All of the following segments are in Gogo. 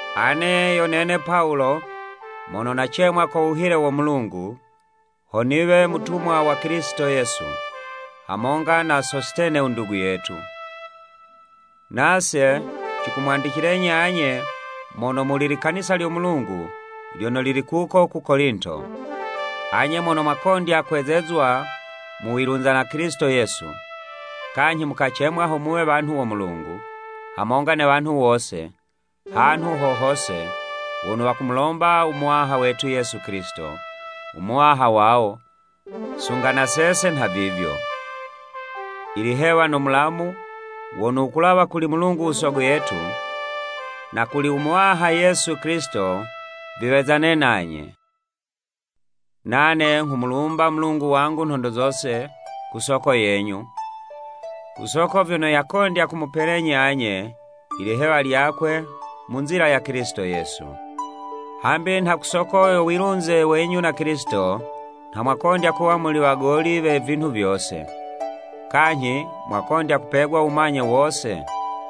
Ane yo nene Pawulo, mono nacemwa ko wuhile wo Mulungu, ho niwe mutumwa wa Kilisito Yesu, hamonga na Sositene u ndugu yetu, nase, cikumwandicilenyi anye mono muli likanisa lyo Mulungu lyono lili kuko ku Kolinto. Anye mono mwakondya kwezezwa mu wilunza na Kilisito Yesu, kanyhi mukacemwa ho muwe wanhu wo Mulungu, hamonga ne wanhu wose, hanhu ho hose, wono wakumulomba u Muwaha wetu Yesu Kilisito, u Muwaha wawo, sunga na sese nhavivyo. Ilihewa no mulamu, wono wukulawa kuli Mulungu u Sogo yetu, na kuli u Muwaha Yesu Kilisito, viwezane nanye. Nane nghumulumba u Mulungu wangu nhondo zose, ku soko yenyu, ku soko vyono yakondya kumupelenyi, anye, i lihewa lyakwe mu nzila ya Kilisito Yesu. Hambi nha ku soko yo wilunze wenyu na Kilisito, nha mwakondya kuwa muli wagoli we vinhu vyose. Kanyhi, mwakondya kupegwa u wumanye wose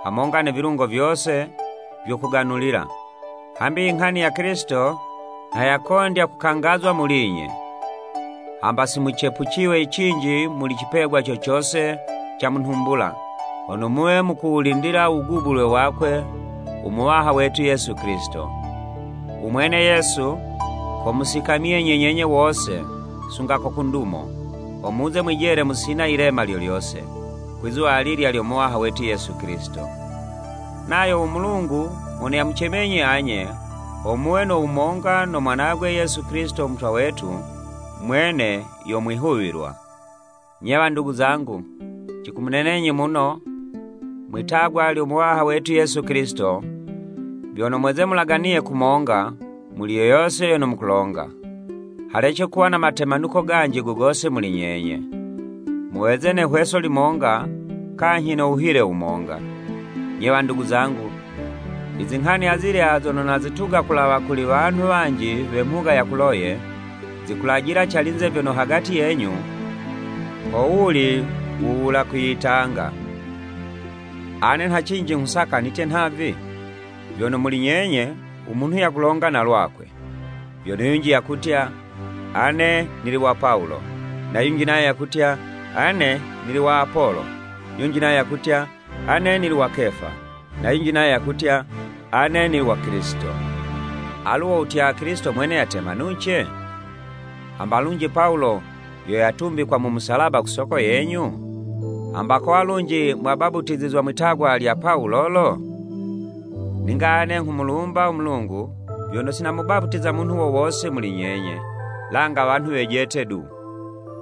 hamonga ne vilungo vyose vyo kuganulila, hambi inghani ya Kilisito nha yakondya kukangazwa muli'nye, hamba si mucepuciywe cinji muli icipegwa co cose ca mu nhumbula, hono muwe mukuwulindila u wugubulwe wakwe u Muwaha wetu Yesu Kilisito. U mwene Yesu, komusikamyenyi nyenye wose sunga ko ku ndumo, ho muze mwijele musina yilema lyo lyose, kwizuwa alilya lyo Muwaha wetu Yesu Kilisito. Nayo u Mulungu mono yamucemenyi anye, ho muwe no wumonga no Mwanagwe Yesu Kilisito u Muwaha wetu, mwene yo mwihuwilwa. Nye wandugu zangu, cikumunenenyi muno, mwi'tagwa lyo Muwaha wetu Yesu Kilisito, vyono mweze mulaganiye kumonga, muli yo yose yono mukulonga, halece kuwa na matemanuko ganji go gose muli nyenye, muweze ne 'hweso limonga kanyhi no wuhile wumonga. Nye, wandugu zangu, izinghani azilya zono nazituga kulawa kuli wanhu wanji we mhuga ya Kuloye, zikulajila calinze vyono hagati yenyu, ho wuli wula kwiyitanga. Ane nha cinji nghusaka nitye nhavi, vyono, muli nyenye u munhu yakulonga na lwakwe, vyono yunji yakutya, “Ane nili wa Pawulo,” na yunji nayo yakutya, “Ane nili wa Apolo,” yunji nayo yakutya, “Ane nili wa Kefa,” na yunji nayo yakutya, “Ane nili wa Kilisito.” Alu wo wutya, Kilisito Mwene yatemanuce? Hamba lunji Pawulo yo yatumbikwa mu musalaba ku soko yenyu? Hamba kowa lunji mwabaputizizwa mwi'tagwa lya Pawulo lo? Ninga ane nghumulumba u Mulungu, vyono si namubaputiza munhu wo wose muli nyenye, langa wanhu wejete du,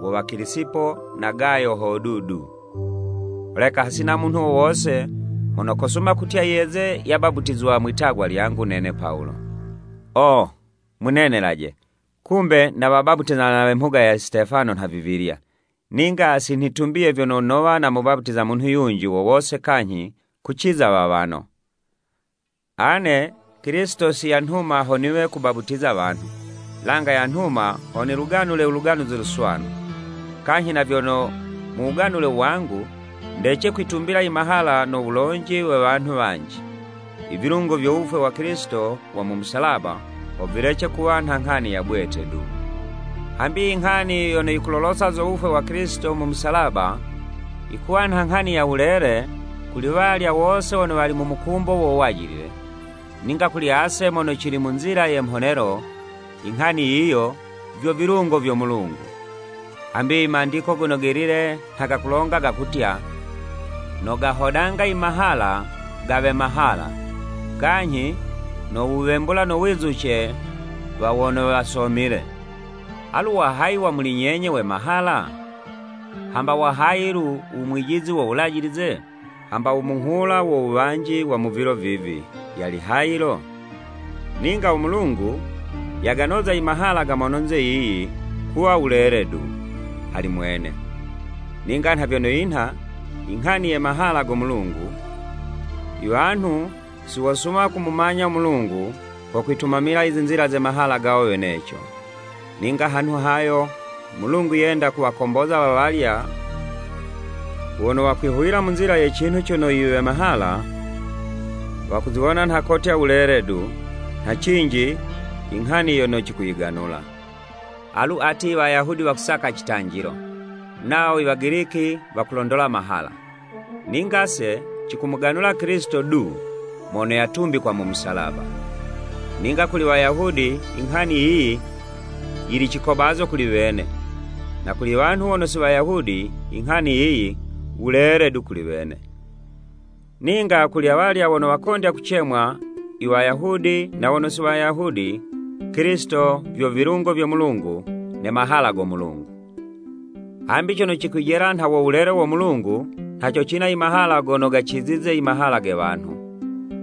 wo wa Kilisipo na Gayo hodu du. Holeka hasina munhu wo wose mono kosuma kutya yeze yabaputizizwa mwi'tagwa lyangu nene Pawulo. (Oo! Munenelaje, kumbe nawabaputiza na we mhuga ya Sitefano nhavivilya, ninga si nitumbiye vyono nowa namubaputiza munhu yunji wo wose kanyhi kuciza wawano.) Ane Kilisito si yanhuma ho niwe kubaputiza wanhu, langa yanhuma ho niluganule u Luganuzi Luswanu, kanyhi na vyono mu wuganule wangu, ndece kwitumbila i mahala no wulonji we wanhu wanji, i vilungo vyo wufwe wa Kilisito wa mu musalaba, ho vilece kuwa nha nghani ya bwete du. Hambi inghani yono yikulolosa zo wufwe wa Kilisito mu musalaba, yikuwa nha nghani ya wulele kuli walya wose wono wali mu mukumbo wo wajilile, ninga kuli ase mono cili mu nzila ye mhonelo, inghani yiyo, vyo vilungo vyo Mulungu. Hambi i Mandiko Gono Gelile nha gakulonga gakutya, “Nogahodanga i mahala ga we mahala, Kanyhi nowuwembula no wizuce wa wono wasomile.” Alu wa hayi wa muli nyenye, we mahala? Hamba wahayi lu, u mwijizi wo wulajilize? Hamba u munghula wo wuwanji wa mu vilo vivi, yali hayi lo? Ninga u Mulungu, yaganoza i mahala ga mononze yiyi, kuwa wulele du, hali Mwene. Ninga nha vyono yinha inghani ye Mahala go Mulungu, iwanhu si wosuma kumumanya u Mulungu, ko kwitumamila i zinzila ze mahala gawo weneco. Ninga hanhu hayo, u Mulungu yenda kuwakomboza wawalya wono wakwihuwila mu nzila ye cinhu cono i we mahala, wakuziwona nha kotya wulele du, nha cinji inghani yono cikuyiganula. Alu ati i Wayahudi wakusaka citanjilo, nawo i Wagiliki wakulondola mahala, ninga 'se, cikumuganula Kilisito du mono yatumbikwa mu musalaba. Ninga kuli Wayahudi inghani yiyi, yili cikobazo kuli wene, na kuli iwanhu wono si Wayahudi, inghani yiyi, wulele du kuli wene, ninga kuli awalya wono wakondya kucemwa, i Wayahudi na wono si Wayahudi Kilisito vyo vilungo vyo Mulungu ne mahala go Mulungu. Hambi cono cikwijela nha wo wulele wo Mulungu, nha co cina i mahala gono gacizize i mahala ge wanhu,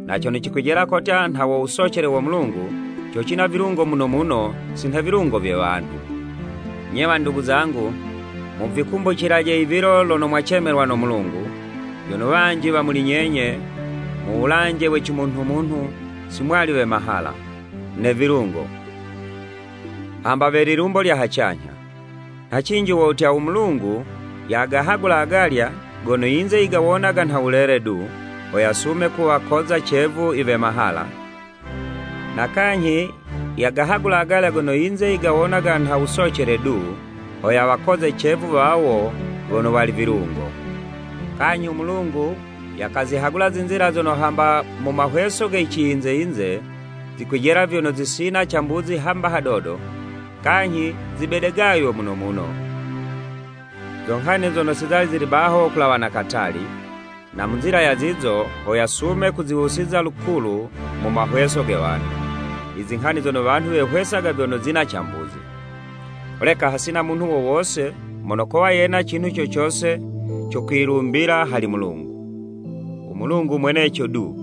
na cono cikwijela kotya nha wo wusocele wo Mulungu, co cina vilungo muno muno si nha ivilungo vye wanhu. Nye wandugu zangu, muvikumbucilaje ivilo lono mwacemelwa no Mulungu, vyono wanji wa muli nyenye, mu wulanje we cimunhumunhu si mwali we mahala, ne vilungo, hamba we lilumbo lya hacanyha. Nha cinji wo wutya, u Mulungu yagahagula agalya, gono yinze yigawonaga nha wulele du, ho yasume kuwakoza cevu i we mahala, na kanyhi yagahagula agalya gono yinze yigawonaga nha wusocele du, ho yawakoze cevu wawo wono wali vilungo. Kanyhi u Mulungu yakazihagula zizilya zono hamba mu mahweso ge ciyinze-yinze, zikwijela vyono zisina cambuzi hamba hadodo kanyhi zibedegaywe muno muno, zo nghani zono si zali zili baho kulawa na katali, na mu nzila ya zizo, ho yasume kuziwusiza lukulu mu mahweso ge wanhu, izinghani zono wanhu wehwesaga vyono zina cambuzi. Holeka hasina munhu wo wose mono kowa yena cinhu co cose co kwilumbila hali Mulungu. U Mulungu mweneco du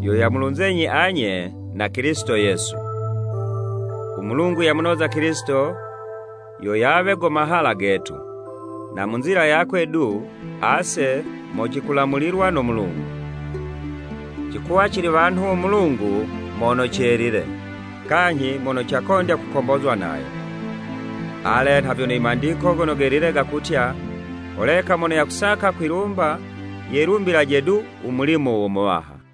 yo yamulunzenyi anye na Kilisito Yesu. U Mulungu yamunoza Kilisito, yo yawe go mahala getu, na mu nzila yakwe du, ase mo cikulamulilwa no Mulungu, cikuwa cili wanhu wo Mulungu mono celile, kanyhi mono cakondya kukombozwa nayo. Ale, nha vyono i Mandiko Gono Gelile gakutya, “Holeka mono yakusaka kwilumba yelumbilaje du u mulimo wo Muwaha.”